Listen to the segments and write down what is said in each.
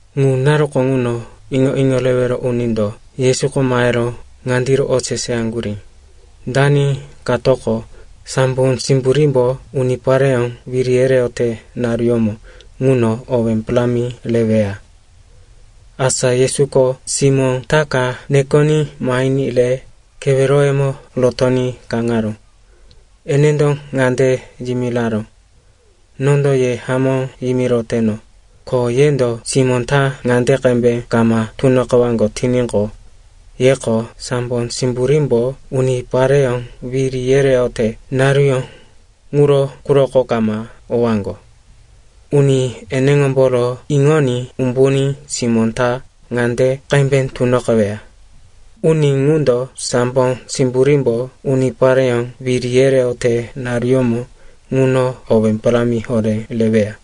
Ŋu naruko ŋuno iŋo-iŋo rewero unindo Yesuko mahero ŋandiro oseseyaŋgurí, “Dani katoko sambo simburímbo unipareyó wiri yereyote naruyómo ŋuno owé parámi reweya?” Asa Yesuko simó ta ka nekoní mahiní re keweroyemo rotoní kaŋaró. Enendo ŋande yimiraró, “Nondo ye hamó yimiroteno, ko yendo simó ta ŋande qembe kama tunoqewaŋgo tiníqo, yeko sambo simburímbo unipareyó wiri yereyote naruyó ŋuro quroko kama owaŋgo. Uni eneŋomboro iŋoní umbuní simó tomó ta ŋande qembe tunoqeweya, uni ŋundo sambo simburímbo unipareyó wiri yereyote naruyómo ŋuno owé parámi horé reweya.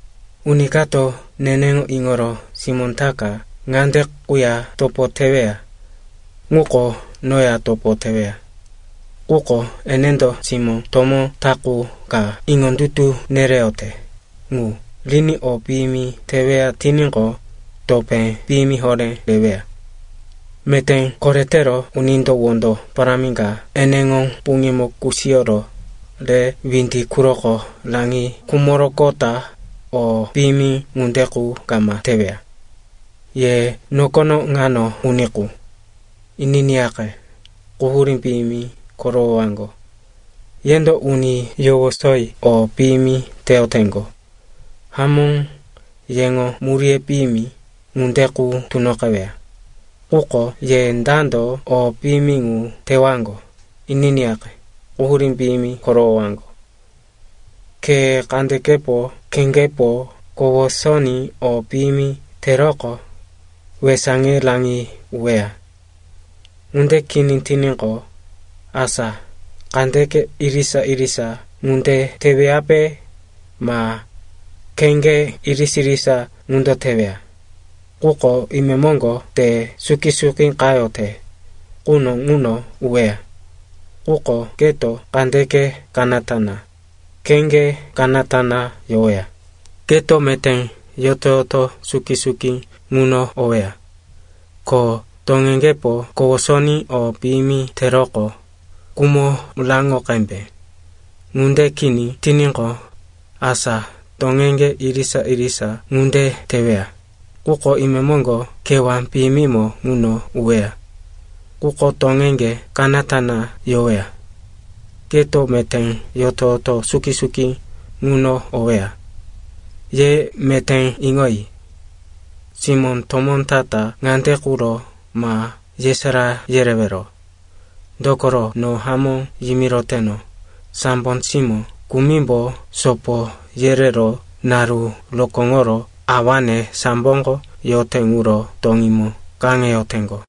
“Uni kato neneŋo iŋoro simó ta ka ŋande quya topo teweya ŋuko noya topo teweya. Quko enendo simó tomó ta qu ka iŋondutu nereyote ŋu riní o piyimi teweya tiníqo, topé piyimi horé reweya. Meté koretero unindo wondo parámi ka eneŋo puŋímo kusiyoro re windi quroko raŋi khumoroqota o piyimi ŋunde qu kama teweya. “Ye nokono ŋano uni qu, ininiyaqe, quhurí piyimi korowowaŋgo. Yendo uni yowosoyi o piyimi teyoteŋgo. Hamó, yeŋo muríye piyimi ŋunde qu tunoqeweya. Quko ye dando o piyimi ŋu tewaŋgo, ininiyaqe, quhurí piyimi korowowaŋgo. “Ke kandekepo, kheŋgepo kowosoní o piyimi teroqo, wesaŋe raŋi uweya. Ŋunde kini tiníqo, asa kandeke irisa-irisa ŋunde teweyape, ma kheŋge irisa-irisa ŋunde teweya, quko imemoŋgo te suki-suki qayote quno ŋuno uweya. Quko keto kandeke kanata na, kheŋge kanata na yoweya, keto meté yoto-yoto suki-suki ŋuno oweya. Ko toŋeŋgepo kowosoní o piyimi teroqo, kumo raŋo qembe. Ŋunde kini tiníqo, asa toŋeŋge irisa-irisa ŋunde teweya, quko imemoŋgo kewá piyimimo ŋuno uweya. Quko toŋeŋge kanata na yoweya, keto meté yoto-yoto suki-suki ŋuno oweya. “Ye meté iŋoyi. Simó tomó ta-ta ŋande quro ma yesará yerewero. Dokoro no hamó yimiroteno, sambo simó kumimbo sopo yerero naru rokóŋoro awane samboko yote ŋuro toŋímo kaŋeyoteŋgo.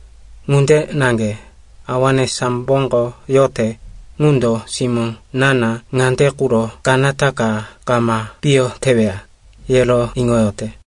Ŋunde naŋge Awane samboko yote ŋundo simó na-na ŋande quro kanata ka kama piyo teweya, yero iŋoyote.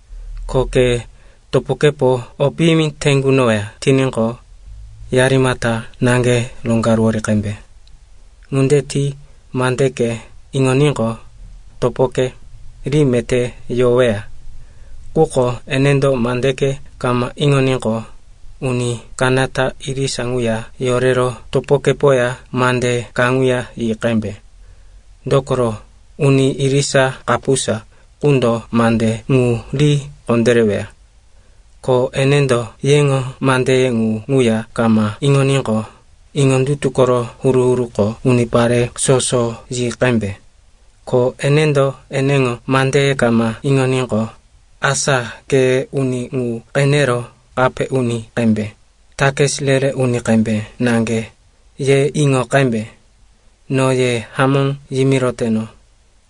“Ko ke topokepo o piyimi te kunoweya tiníqo, yarimata naŋge roŋgaruwori qembe. Ŋunde ti mandeke iŋoníqo, topoke ri meté yoweya. Quko enendo mandeke kama iŋoníqo, uni kanata, irisa ŋuya yorero topokepoya mande kaŋuya yi qembe. Dokoro uni irisa, kapusa qundo mande ŋu ri kondéreweya. Ko enendo yeŋo mandeye ŋu ŋuya kama iŋoníqo, iŋondutu koro huru-huruko unipare soso yi qembe. Ko enendo eneŋo mandeye kama iŋoníqo, asa ke uni ŋu qenero, kape uni qembe, takis re-re uni qembe naŋge, ye iŋo qembe. “No ye hamó yimiroteno,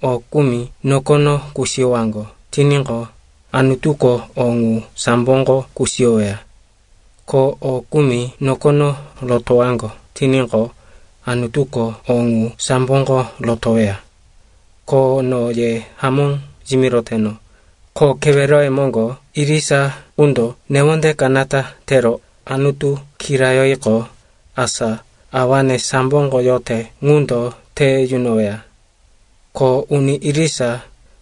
o kumi nokono kusiyowaŋgo tiníqo, Anutuko o ŋu samboko kusiyoweya. Ko o kumi nokono rotowaŋgo tiníqo, Anutuko o ŋu samboko rotoweya. “Ko no ye hamó yimiroteno, ko keweroye moŋgo irisa qundo newonde kanata tero Anutu kirayoriqo, asa awane samboko yote ŋundo te yunoweya. Ko uni irisa,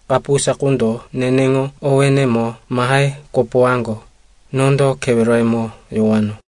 kapusa qundo neneŋo owénemo mahe kopowaŋgo, nondo keweroyemo yowano.”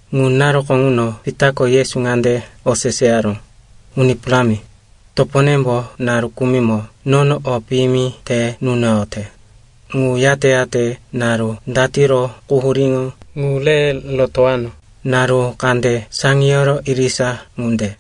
Ŋu naruko ŋuno Pitako Yesu ŋande oseseyaró, “Uni Parámi, toponembo naru kumimo nono o piyimi te nunoyote, ŋu yate-yate naru datiro quhuríŋo ŋu re rotowano? Naru kande saŋiyoro irisa ŋunde?”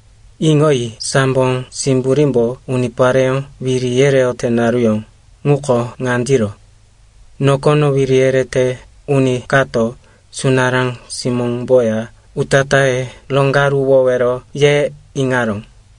“Iŋoyi, sambo simburímbo unipareyó wiri yereyote naruyó ŋuko ŋandiro: nokono wiri yerete uni kato sunará simóŋomboya utatáye roŋgaruwowero ye iŋaró.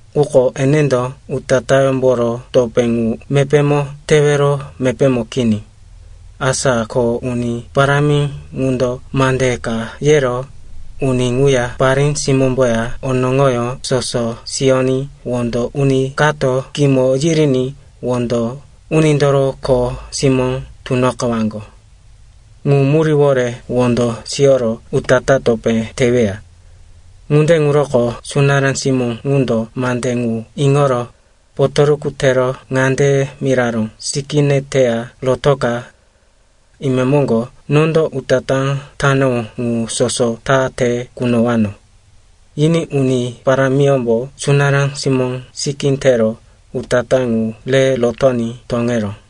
Quko enendo utatáyómboro topé ŋu mepémo tewero mepémo kini. Asa ko uni parámi ŋundo mande ka yero uni ŋuya parí-simómboya onoŋoyó soso siyoní wondo uni kato kimo yiriní wondo unindoro kho simó tunoqewaŋgo. Ŋu muríwore wondo siyoro utatá topé teweya. “Ŋunde ŋuroko sunará simó ŋundo mande ŋu iŋoro potoruku tero ŋande miraró, ‘Sikíne teya rotoka. Imemoŋgo nondo utatá tanowó ŋu soso ta te kunowano.’ Yiní uni parámiyómbo sunará simóŋo sikí tero utatá ŋu re rotoní toŋeró.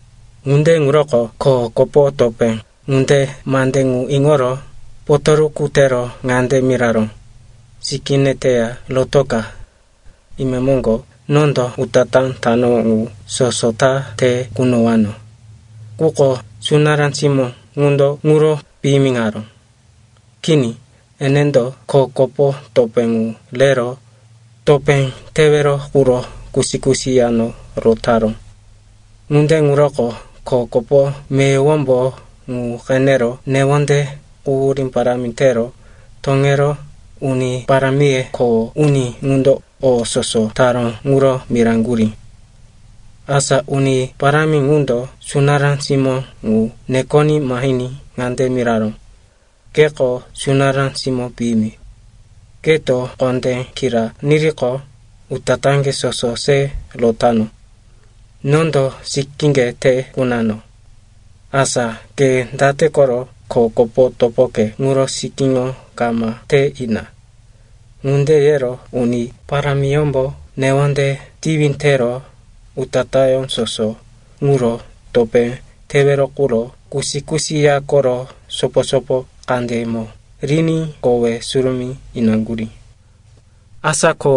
“Ŋunde ŋuroko kho kopo topé ŋunde mande ŋu iŋoro potoruku tero ŋande miraró, ‘Sikíne teya rotoka. Imemoŋgo nondo utatá tanowó ŋu soso ta te kunowano.’ “Quko sunará simó ŋundo ŋuro piyimiŋaró. Kini, enendo kho kopo topé ŋu rero topé tewero quro kusi-kusi yano rotaró. Ŋunde ŋuroko kho kopo meyowombo ŋu qenero newonde quhurí parámi tero toŋero uni parámiye kho uni ŋundo o soso taró ŋuro miraŋgurí. “Asa uni parámi ŋundo sunará simó ŋu nekoní mahiní ŋande miraró, ‘Keko sunará simó piyimi. Keto kondé kira niriqo, utatáŋge soso se rotano. Nondo sikíŋge te kunano. Asa ke date koro kho kopo topoke ŋuro sikíŋo kama te ina?’ Ŋunde yero uni parámiyómbo newonde tiwi tero utatáyó soso ŋuro topé tewero quro kusi-kusi ya koro sopo-sopo kandeyemo riní kowe surumí inaŋgurí. “Asa ko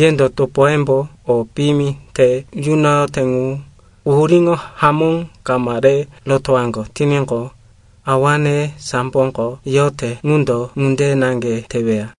yendo topoyembo o piyimi te yunoyote ŋu quhuríŋo hamó kama re rotowaŋgo tiníqo, awane samboko yote ŋundo ŋunde naŋge teweya.”